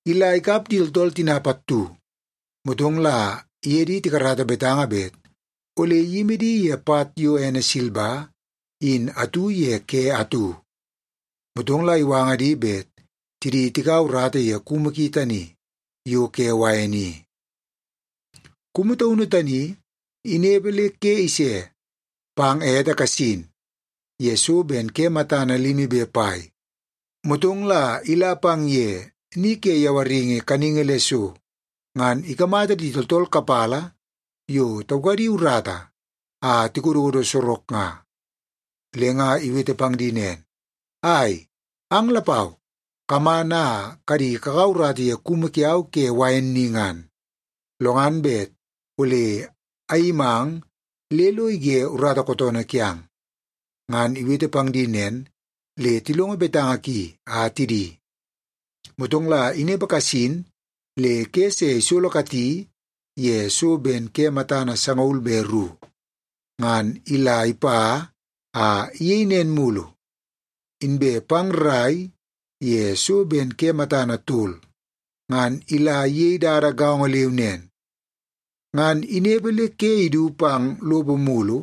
Ila ikap di tooltool tina pattu, motong la iye di tikarata betanga bet ole iyimi di ye pat yo ene silba in atu ye ke atu. Motong la iwanga di bet tidi tikaua urata ye kumu ki tani yo ke wain i. “Kumu taunu tani inepe le ke ise pang ete kasin ye so ben ke matana limi be pai, motong la ila pang ye ni ke yawaringi kaningi le so, ngan ikamata di tooltool kapala yo taukadi urata a tikododo sorok nga. Le nga iwete pang di nen, ‘Ai, ang lapau kaman a kadi kakaua urata ye kumu kiau ke wain ni ngan. Lo ngan bet ole ayimang le lo ige urata kootoonoo kiang.’ Ngan iwete pang di nen, le tilongo betanga ki a tidi. “Motong la inepe kasin le ke se isolokati ye so ben ke matana sangaul be ru, ngan ila ipa a iyei nen mulu. Inbe pang rrai ye so ben ke matana tol, ngan ila iyei dada gaongo leu nen. Ngan inepe le ke idu pang lopo mulu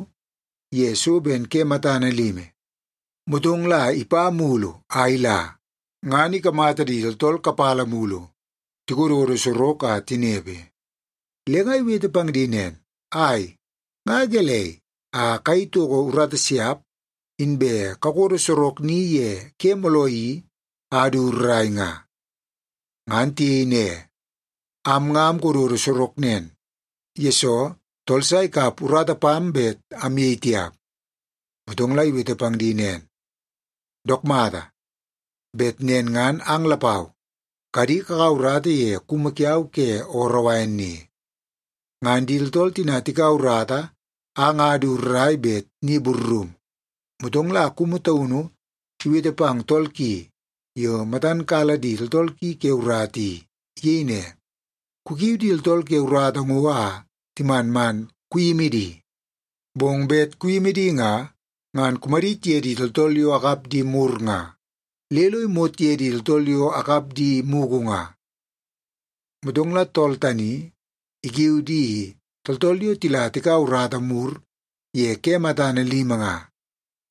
ye so ben ke matana limi, motong la ipa mulu a ila, ngan ikamata di tooltool kapala mulu tikododo sorok a tinepe. Le nga iwete pang di nen, ‘Ai, nga gelei a kayei toko urata siap inbe kakodo sorok ni ye ke mooloo i a du rrai nga?’ “Ngan tiyei ne, ‘Am nga amkododo sorok nen, yesoo tool sa ikap urata pam bet amyei tiap.’ “Motong iwete pang di nen, ‘Dook mata! Bet nen ngan ang lapau kadi kakaua urata ye kumu kiau ke ooroo wain ni.’ “Ngan di tooltool tina tikaua urata a nga du rrai bet ni burrum, motong la kumu taunu iwete pang tool ki yo matan kala di tooltool ki ke urata i. Iyei ne, ‘Kukiu di tooltool ke urata ngo a timan man kuyimi di. Bong bet kuyimi di nga, ngan kumadit ye di tooltool yo akap di mur nga, le lo imot ye di tooltool yo akap di mugu nga.’ “Motong la tool tani ikiu di tooltool yo tila tikaua urata mur ye ke matana limi nga,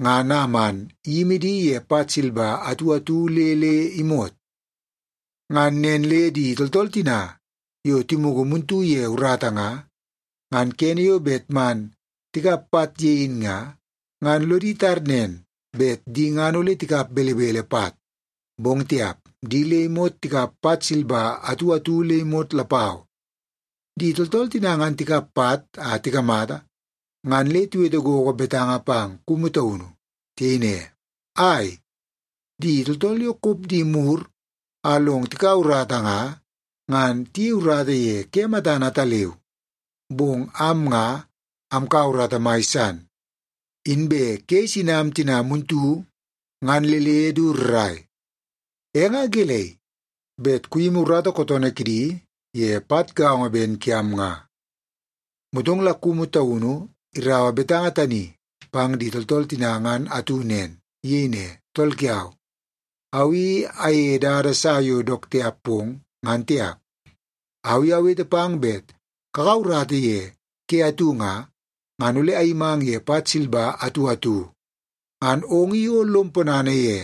ngan a man iyimi di ye pat silba atu atu le le imot. Ngan nen le di tooltool tina yo timugu muntu ye urata nga, ngan kene yo bet man tikap pat ye in nga, ngan lodi tar nen, bet di ngan ole tikap belebele pat. Bong tiap, di le imot tikap pat silba atu atu le imot lapau. Di tooltool tina ngan tikap pat a tikamata, ngan le tiwete gogo betanga pang kumu taunu. Tiyei ne, ‘Ai, di tooltool yo kop di mur a long tikaua urata nga, ngan tiyei urata ye ke matana ataleu. Bong am nga amkaua urata mai san, inbe ke isinam tina muntu ngan le le du rrai. E nga gelei bet kuyimi urata kootoonoo kidi ye pat gaongo ben kiam nga?’ “Motong la kumu taunu iraua betanga tani pang di tooltool tina ngan atu nen. Iyei ne, ‘Tool kiau, au i ayeie dada sa yo dook tiap pong, ngan tiap. Au i awete pang bet kakaua urata ye ke atu nga, ngan ole ayimang ye pat silba atu atu, ngan ong i o lom ponana ye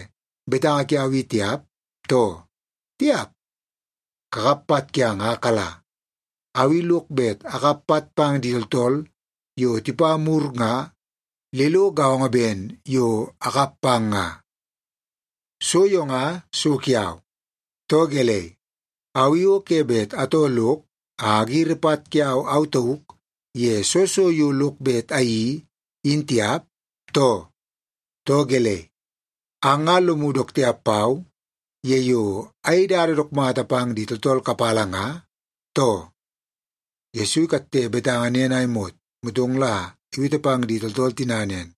betanga kiau i tiap, too? Tiap! Kakap pat kiang a kala. Au i lok bet akap pat pang di tooltool yo tipa mur nga, le lo gaongo ben yo akap pang nga. So yo nga so kiau. Too gelei, au i o ke bet atoo lok a agiri pat kiau au tauk ye soo so yo lok bet ayeii, in tiap, too? Too gelei, ang nga lomu dook tiap pau ye yo ayei dada dook mata pang di tooltool kapala nga, too?’” Yesu ikatte betanga nen a imot, motong la iwete pang di tooltool tina nen,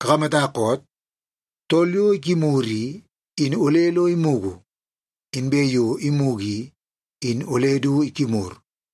“Kakamata koot? Tool yo ikimur i, in ole lo imugu, inbe yo imugu i, in ole du ikimur.”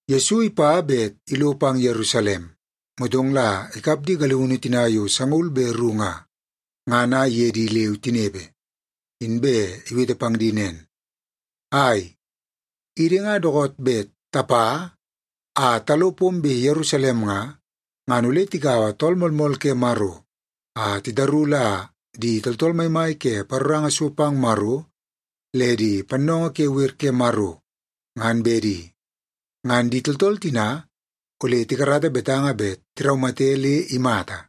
Yesu ipa bet ilo pang Yerusalem, motong la ikap di galiunu tina yo sangaul be ru nga, ngan a iye di leu tinepe, inbe iwete pang di nen, “Ai, idi nga dookoot bet tapa a talo pombe Yerusalem nga, ngan ole tikaua Tool Moolmool ke Maro a titaru la di tooltool maimai ke paroranga so pang Maro le di pannoongoo ke wer ke Maro, ngan bedi. Ngan di tooltool tina ole tikarata betanga bet tiraumate le imata.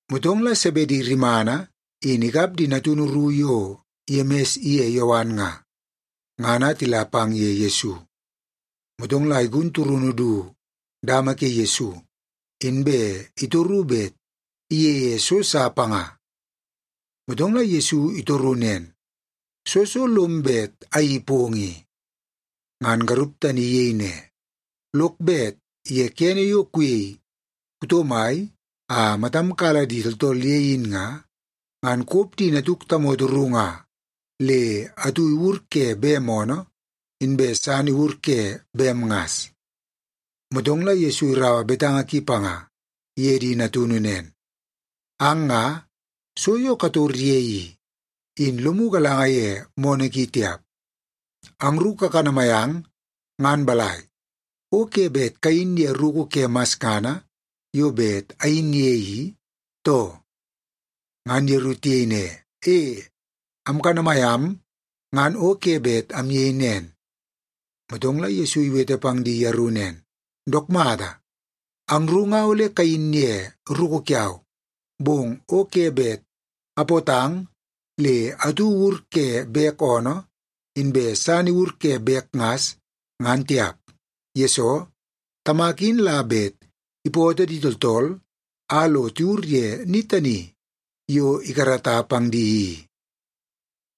Motong la Sebedi rimana in ikap di natunu ru yo Yemis iye Yowan nga, ngan a tila pang ye Yesu. Motong la igun turunu du dama ke Yesu, inbe itoru bet iyeie so sa panga. Motong la Yesu itoru nen, “Soo so lom bet ayeii pong i?” Ngan garup tani iyei ne, “Lok bet ye kene yo kuyei kuto mai a matam kala di tooltool ye in nga, ngan kop di natuk tamoto ru nga le atu iwur ke bem oonoo, inbe san iwur ke bem ngas.” Motong la Yesu iraua betanga ki panga iye di natunu nen, “Ang nga, so yo kator ye i, in lomu galanga ye moonoo ki tiap. Angru kakanamai ang ngan balai, o ke bet kayin ye ruku ke masngana yo bet ayin ye i, too?” Ngan yeru tiyei ne, “E, amkanamai am ngan o ke bet amyei nen.” Motong la Yesu iwete pang di yeru nen, “Dook mata, angru nga ole kayin ye ruku kiau. Bong o ke bet apootang le atu iwur ke bek oonoo, inbe san iwur ke bek ngas, ngan tiap. Yesoo, Tamak in la bet ipootoo di tooltool a lo tiwur ye ni tani yo ikarata pang di i.”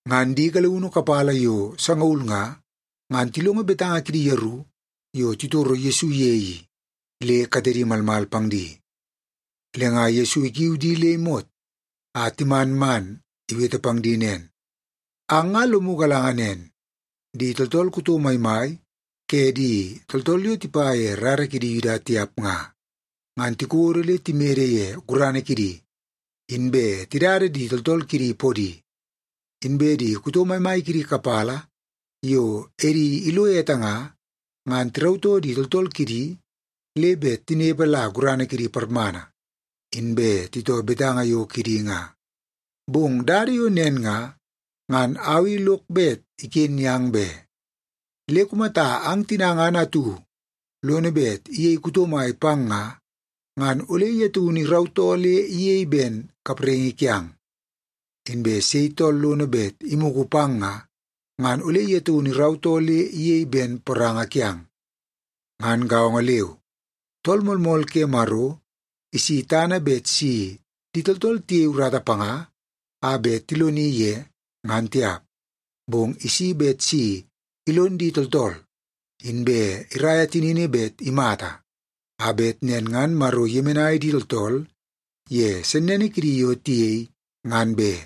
Ngan di galiunu kapala yo sangaul nga, ngan tilongo betanga kidi yeru yo titoro Yesu ye i, le katedi malmal pang di. Le nga Yesu ikiu di le imot a timan man iwete pang di nen, “Ang nga lomu galanga nen, di tooltool kuto maimai ke di tooltool yo tipa ye rara kidi Yuda tiap nga, ngan tikodo le timede ye gurana kidi, inbe tidada di tooltool kidi podi. Inbe di kuto maimai kidi kapala yo edi ilo ete nga, ngan tirautoo di tooltool kidi le bet tinepe la gurana kidi parmana, inbe titoo betanga yo kidi nga. Bong dada yo nen nga, ngan au i lok bet iken yang be. Le kumata ang tina ngan atu lono bet iyei kuto mai pang nga, ngan ole ye taunu irautoo le iyei ben kapraingi kiang. Inbe sei tool lono bet imugu pang nga, ngan ole ye taunu irautoo le iyei ben poranga kiang. Ngan gaongo leu, Tool Moolmool ke Maro isi tana bet si di tooltool tiyei urata panga a bet tiloni ye, ngan tiap. Bong isi bet si ilon di tooltool, inbe iraia tinini bet imata, a bet nen ngan Maro iyemenai di tooltool ye sennene kidi yo tiyei, ngan be.”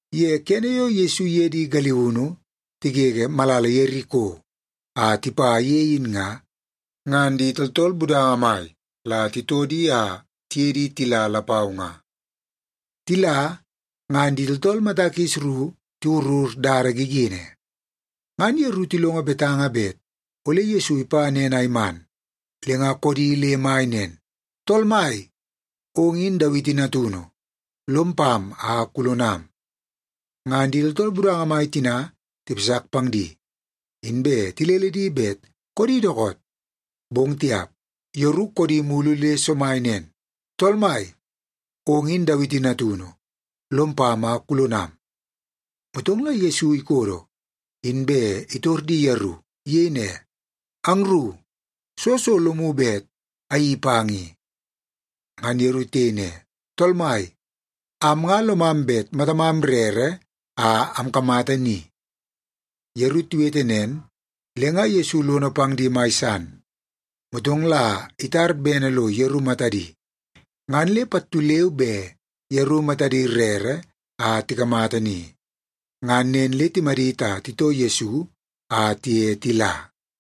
Ye kene yo Yesu iye di galiunu tigege malala Yeriko a tipa ye in nga, ngan di tooltool budanga mai la titoo di a tiye di tila lapau nga. Tila, ngan di tooltool mata kis ru tiwurur dada gigini. Ngan yeru tilongo betanga bet ole Yesu ipa nen a iman, le nga koodi le mai nen, “Tool Mai, ong in Dawiti natunu. Lom pam a kulonam!” Ngan di tooltool budanga mai tina tipasak pang di, inbe tilele di bet koodi dookoot. Bong tiap, yeru koodi mulu le somai nen, “Tool Mai, ong in Dawiti natunu. Lom pam a kulonam!” Motong la Yesu ikodo, inbe itor di yeru. Iyei ne, “Angru, soo so lomu bet ayeii pang i?” Ngan yeru tiyei ne, “Tool Mai, am nga lomam bet matamam rere a amkamata ni.” Yeru tiwete nen, le nga Yesu lono pang di mai san. Motong la itar bene lo yeru matadi, ngan le pattu leu be yeru matadi rere a tikamata ni. Ngan nen le timadit a titoo Yesu a tiye tila.